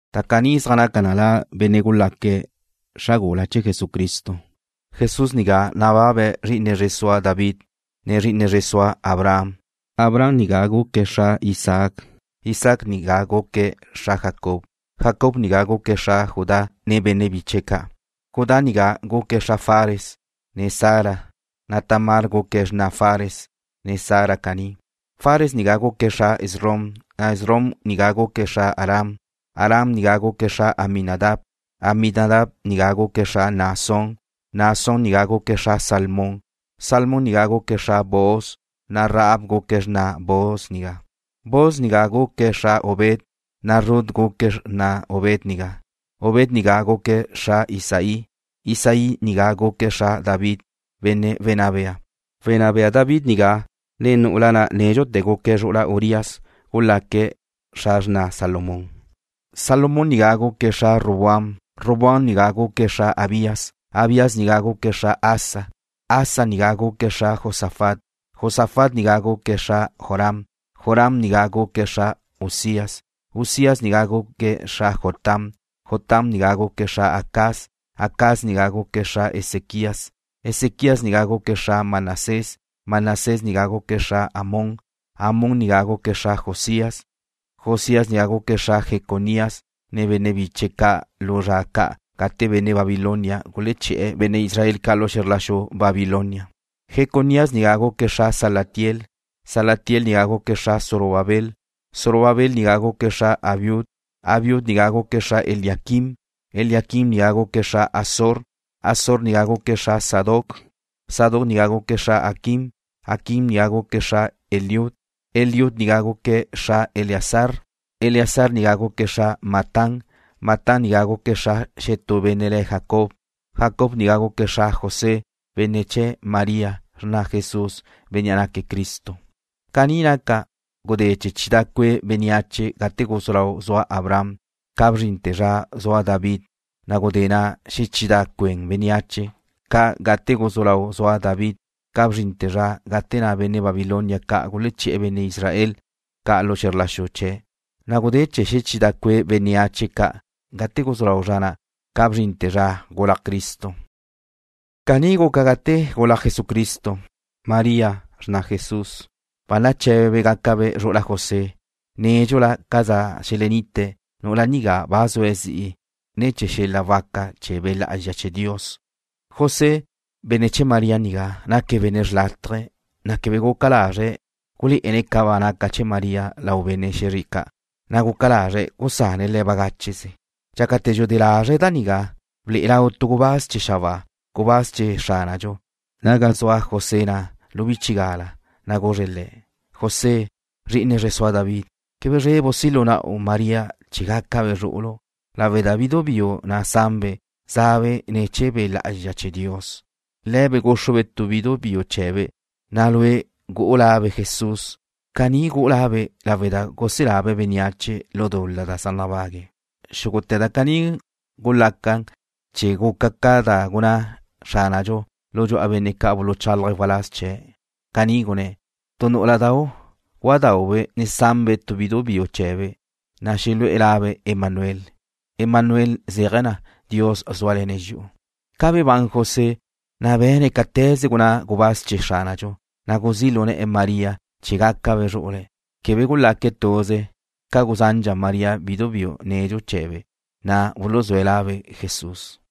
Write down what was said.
Da caní zaj naca na la chee̱ benne' zaj naque̱' xra wdé chee̱ Jesucristo. Jesús nigá nababe̱' zri'ine zre sua David, ne zri'ine zre sua Abraham. Abraham nigá guque̱' xra Isaac. Isaac nigá guque̱' xra Jacob. Jacob nigá guque̱' xra Judá, ne benne' biche̱' ca'. Judá nigá guque̱' xra Fares, ne Zara, na' Tamar guque̱' xrna Fares, ne Zara caní. Fares nigá guque̱' xra Esrom. Esrom nigá guque̱' xra Aram. Aram nigá guque̱' xra Aminadab. Aminadab nigá guque̱' xra Naasón. Naasón nigá guque̱' xra Salmón. Salmón nigá guque̱' xra Booz, na' Rahab guque̱' xrna Booz nigá. Booz nigá guque̱' xra Obed, na' Rut guque̱' xrna Obed nigá. Obed nigá guque̱' xra Isaí. Isaí nigá guque̱' xra David, benne' wenná bea. Wenná bea David nigá, ne nu'ula na' nédxute̱ guque̱' zru'ula Urías gulaque̱' xra xrna Salomón. Salomón nigá guque̱' xra Roboam. Roboam nigá guque̱' xra Abías. Abías nigá guque̱' xra Asa. Asa nigá guque̱' xra Josafat. Josafat nigá guque̱' xra Joram. Joram nigá guque̱' xra Uzías. Uzías nigá guque̱' xra Jotam. Jotam nigá guque̱' xra Acaz. Acaz nigá guque̱' xra Ezequías. Ezequías nigá guque̱' xra Manasés. Manasés nigá guque̱' xra Amón Amón nigá guque̱' xra Josías. Josías nigá guque̱' xra Jeconías ne benne' biche̱' ca' ca lu zra ca' gate benne' Babilonia guleché̱'e̱ benne' Israel ca' lu xe̱zr la xu Babilonia. Jeconías nigá guque̱' xra Salatiel. Salatiel nigá guque̱' xra Zorobabel. Zorobabel nigá guque̱' xra Abiud. Abiud nigá guque̱' xra Eliaquim. Eliaquim nigá guque̱' xra Azor. Azor nigá guque̱' xra Sadoc. Sadoc nigá guque̱' xra Aquim. Aquim nigá guque̱' xra Eliud. Eliud nigá guque̱' xra Eleazar. Eleazar nigá guque̱' xra Matán. Matán nigá guque̱' xra xetú benne' le̱' Jacob. Jacob nigá guque̱' xra José, benne' chee̱ María, xrna Jesús, Bénnea' naque̱' Cristo. Caní naca, gulaca chidá' cue' bénneache gate guzú lau zua Abraham, ca bzrinte̱ zra zua David, na' gulaca xechidá' cue' bénneache ca' gate guzú lau zua David, ca bzrinte̱ zra gate na' benne' Babilonia ca' guleché̱'e̱ benne' Israel ca' lu xe̱zr la xu chee̱', na' gulaca xechidá' cue' bénneache ca' gate guzú lau zra na', ca bzrinte̱ zra gulaj Cristo. Caní guca gate na' gulaj Jesucristo. María, xrna Jesús ba naché̱bebe' gácabe' zru'ula José. Nédxula ca za xelenite̱', nu'ula nigá ba zue̱' zi'i ne̱ chee̱ xel-la' waca chee̱ Be' Lá'azxa chee̱ Dios. José, benne' chee̱ María nigá, naque̱' benne' xrlátaje. Quebe guca lazre̱' gulé'ene̱' ca ba naca chee̱ María lau benne' xe̱zre ca'. Guca lazre̱' gusane̱' le̱' bagácheze. Dxácate̱ dxudé lazre̱' da nigá, ble'e lau tu gubáz chee̱ xabáa, gubáz chee̱ Xránadxu, ga zua José na' lu bchigala, na' guzre̱' le̱': ―José, zri'ine zre sua David, quebe zrebu' si' lu na'u María chee̱ gácabe' zru'ulu', lawe' da bidu biu na' sanbe' zabe' ne̱ chee̱ Be' Lá'azxa chee̱ Dios. Zrú'ulu' gúxrube' tu bidu biu chee̱be', na' lue' gu'u labe' Jesús. Caní gu'u labe' lawe' da guselabe' bénneache lu dul-la da zaj nabague̱'. Xúgute̱ da caní gulaca ca' chee̱ guca ca da gunná Xránadxu lu dxu'a benne' ca' buluchálaje̱' waláz chee̱'. Caní gunné̱': Tu nú'uladau' gúadaube' sanbe' tu bidu biu chee̱be', na' xelu'e̱ labe' Emanuel. Emanuel zéaje̱ na: Dios zúale̱ne̱' dxi'u. Ca bebán José, na' be̱ne̱' cáte̱ze gunná gubáz chee̱ Xránadxu, na' guzí' lu ne̱'e̱ María chee̱ gácabe' zru'ule̱'. Quebe gulaque̱' tuze ca gusandxa María bidu biu nedxu chee̱be', na' buluzúe̱' labe' Jesús.